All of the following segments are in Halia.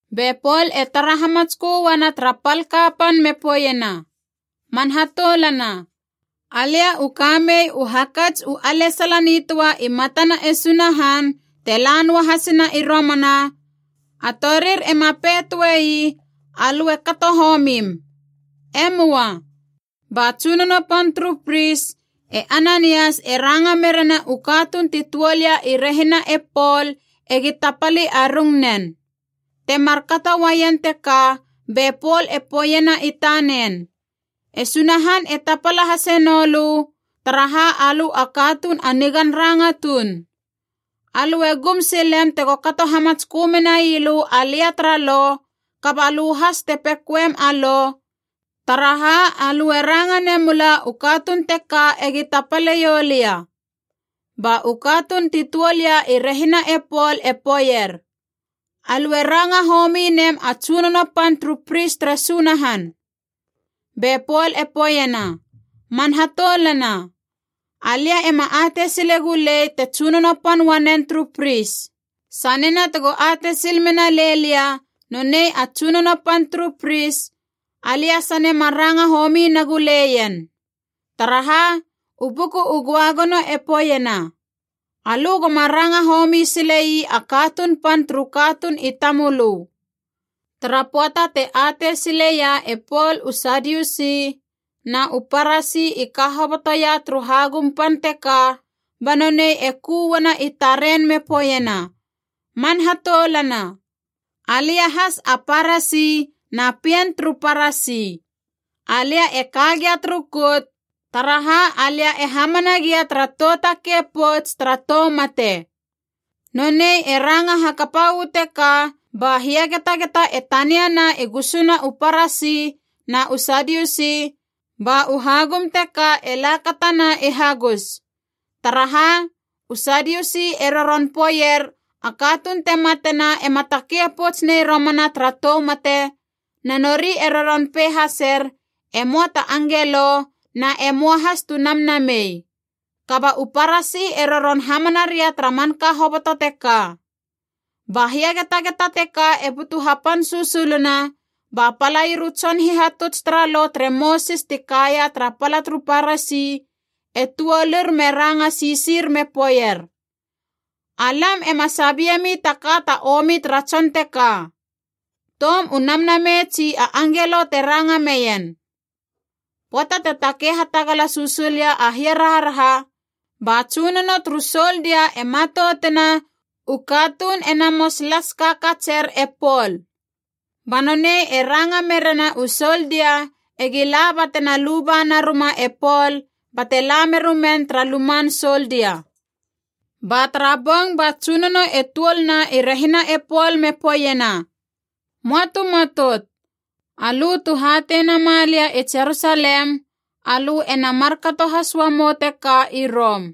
Be Pol e tara hamatskö uana tara pal kapan me poeiena, “Man hatoulana, alia u ka mei u hakats u alesala nitöa i matana e Sunahan te la noa hasina i romana, a torir ema pei töe ii ‘Alö e kato homim.’ E möa.” Ba tsunono pan turu pris, e Ananias e ranga merena u katuun ti tuol ia i rehina e Pol egi tapali a rungnen. Te mar kato uaien teka be Pol e poeiena i tanen, “E Sunahan e tapala hase nou lö, taraha alö a katuun a nigan ranga tuun! Alö e gum silem tego kato hamatskö menai lö alia tara lo, kaba lö has te pekoem a lo, taraha alö e ranga memula u katuun teka egi tapale ioulia!” Ba u katuun ti tuol ia i rehina e Pol i poeier, “Alö e ranga homi nem a tsunono pan turu pris tere Sunahan!” Be Pol e poeiena, “Man hatoulana, alia ema atei sile gulei te tsunono pan uanen turu pris. Sanena tego atei sil mena lei lia nonei a tsunono pan turu pris, alia sane ma ranga homi nagu leien. Taraha, u Buku u Göagono e poeiena, ‘Alö goma ranga homi sile ii a katuun pan turu katuun i tamölö.’” Tara pöata te atei sileia e Pol u Sadiusi na u Parasi i ka hobotoia turu hagum pan teka, ba nonei e ku uana i taren me poeiena, “Man hatoulana, alia has a Parasi na pien turu Parasi. Alia e ka gia turu kout, taraha alia e hamana gia tara tou takei pouts tara tou mate!” Nonei e ranga hakapa uu teka ba hiagetageta e taniana i gusuna u Parasi na u Sadiusi, ba u hagum teka e lakatana i hagus. Taraha, u Sadiusi e roron poeier a katuun te matena ema takei pouts nei romana tara tou mate, na nori e roron pei haser e möa ta angelo na e möa has tu namnamei. Kaba u Parasi e roron hamana ria tara manka hoboto teka. Ba hiagetageta teka e butu hapan susuluna, ba palair u tson hihatuts tara Lo tere Mosis ti kaia tara pala turu Parasi e tuolur me ranga sisir me poeier, “Alam ema sabiemi ta ka ta omi tara tson teka. Toum u namnamei tsi a angelo te ranga meien.” Pöata te takei hatagala susul ia a hiaraharaha, ba tsunono turu soldia e matoutena u katuun e namots las kakatser e Pol! Ba nonei e ranga merena u soldia egi la batena luba naruma e Pol bate la merumen tara luman soldia. Ba tara bong ba Tsunono e tuolna i rehina e Pol me poeiena, “Möa tu matout. Alö tu hatei nama lia i Jerusalem, alö ena markato has uamou teka i Rom.”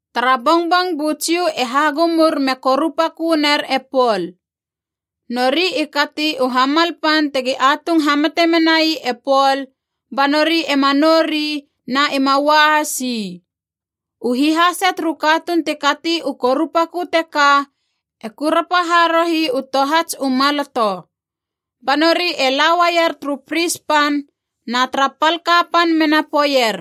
Tara bongbong bu Jiu e hagumur me korupakö ner e Pol. Nori i kati u hamal pan tegi atung hamate menai e Pol ba nori ema nou ri na ima ua has ii. U hihase turu katuun ti kati u korupakö teka e kurapa harohi u tohats u maloto. Ba nori e la uaier turu pris pan na tara pal kapan mena poeier,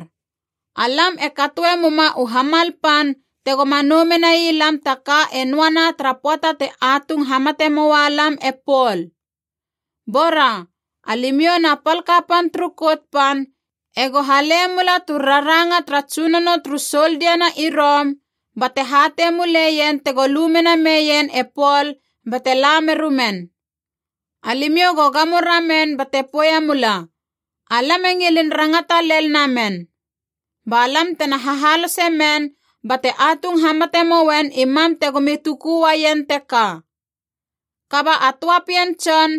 “Alam e katoe muma u hamal pan tegoma nou menai lam ta ka e noana tara pöata te atung hamate moa lam e Pol. Bora, alimiou na pal kapan turu Kout Pan ego hale mula tu raranga tara tsunono turu soldia na i Rom bate hatei muleien tego lu mena meien e Pol bate la merumen. Alimiou go gamo ramen bate poeiemula, ‘Alam e ngilin rangata lel namen.’ Ba lam tena hahalose men bate atung hamate mouen i mam tegomi tuku uaien teka.” Kaba a töa pien tson,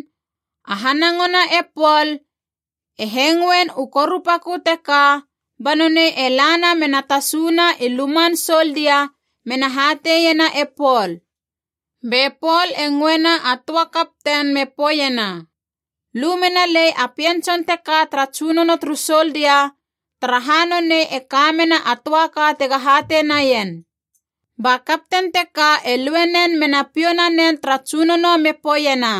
a hanangona e Pol, e hengoen u korupakö teka, ba nonei e lana mena tasuna i luman soldia mena hateiena e Pol. Be Pol e ngöena a töa kapten me poeiena, “Lu mena lei a pien tson teka tara tsunono turu soldia, taraha nonei e ka mena a töa ka tega hatei naien.” Ba kapten teka e lue nen me na piou nanen tara tsunono mena poeiena,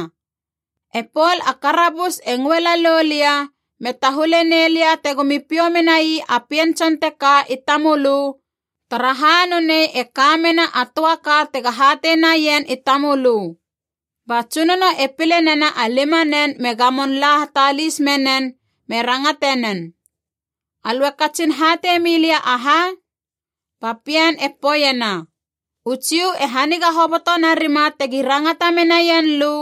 “E Pol a karabus e ngöe lalou lia me tahule nei lia tegomi piou menai a pien tson teka i tamölö, taraha nonei e ka mena a töa ka tega hatei naien i tamölö.” Ba tsunono e pile nena a limanen me gamon la hatalis menen me rangate nen, “Alö e katsin hatei mi lia aha?” Ba pien e poeiena, “U Jiu e haniga hoboto narima tegi rangata menaien lö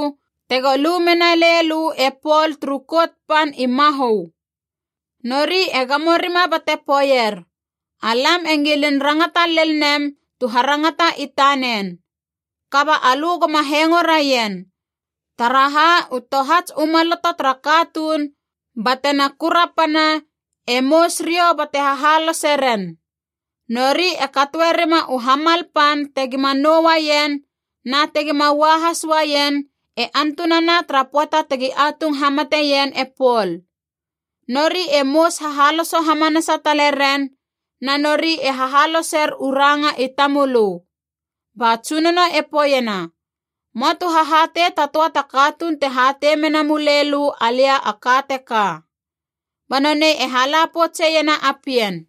tego lu mena lei lö e Pol turu Kout Pan i mahö. Nori e gamo rima bate poeier, ‘Alam e ngilin rangata lel nem tu harangata i tanen.’ Kaba alö goma hengo raien, taraha u tohats u maloto tara katuun batena kurapana e mous riou bate hahalose ren. Nori e katoe rima u hamal pan tegima nou uaien na tegima ua has uaien e antunana tara pöata tegi atung hamateien e Pol. Nori e mous hahaloso hamanasa tale ren, na nori e hahaloser u ranga i tamölö.” Ba tsunono e poeiena, “Möa tu hahatei ta töa ta katuun te hatei mena mulei lö alia a ka teka.” Ba nonei e hala poutseiena a pien.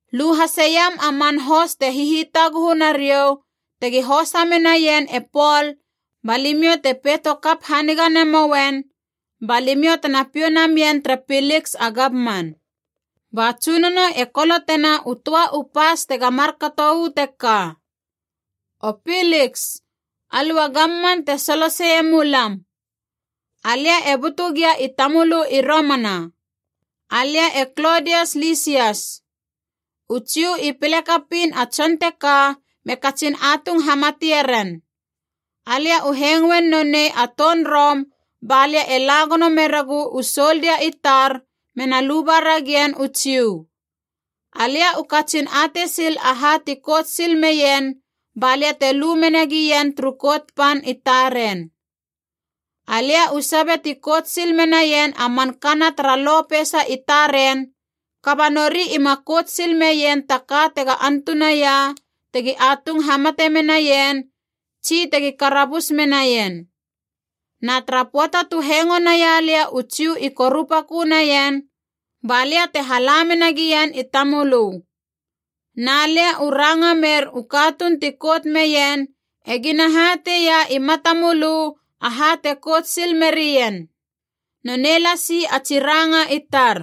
Lu hasiam a man hos te hihitaguhu nariou tegi hosa menaien e Pol ba limiou te peito kap haniga namouen, ba limiou tena piou namien tere Piliks a gamman.” Ba tsunono e kolotena u töa u pas tega markato uu teka: “O Piliks, alö a gamman te soloseie mulam. Alia e butu gia i tamölö i romana. Alia e Klodias Lisias. U Jiu i pile kapiin a tson teka me katsin atung hamatie ren. Alia u hengoin nonei a toun Rom ba lia e la gono meregu u soldia i tar mena luba ragien u Jiu. Alia u katsin atei sil aha ti kout sil meien balia te lu mena gien turu Kout Pan i taren. Alia u sabe ti kout sil menaien a man kana tara lo peisa i taren, kaba nori ima kout sil meien ta ka tega antunaia tegi atung hamate menaien tsi tegi karabus menaien. Na tara pöata tu hengo naia lia u Jiu i korupakö naien, ba lia te hala menagien i tamölö. Na lia u ranga mer u katuun ti kout meien egina hateia i mata mölö aha te kout sil merien. Nonei lasi a tsi ranga i tar.”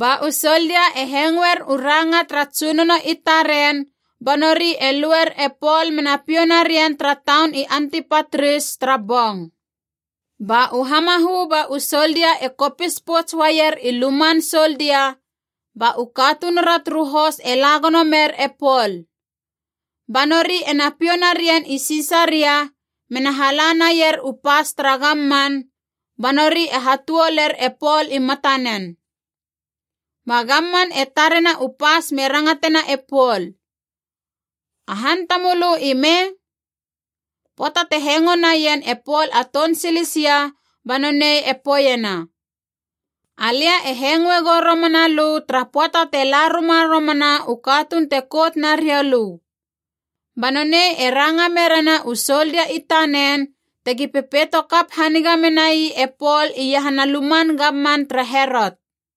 Ba u soldia e hengoer u ranga tara tsunono i taren ba nori e luer e Pol mena piou narien tara taun i Antipatris tara bong. Ba u hamahö ba u soldia e kopis pouts uaier i luman soldia, ba u katunura turu hos e la gono mer e Pol. Ba nori ena piou narien i Sisaria mena hala naier u pas tara gamman, ba nori e hatuoler e Pol i matanen. Ba gamman e tarena u pas me rangatena e Pol, “A han tamölö i me?” Pöata te hengo naien e Pol a toun Silisia ba nonei e poeiena, “Alia e hengoe gou romana lö tara pöata te la ruma romana u katuun te kout nariou lö.” Ba nonei e ranga merena u soldia i tanen tegi pepeito kap haniga menai e Pol iahana luman gamman tere Herot.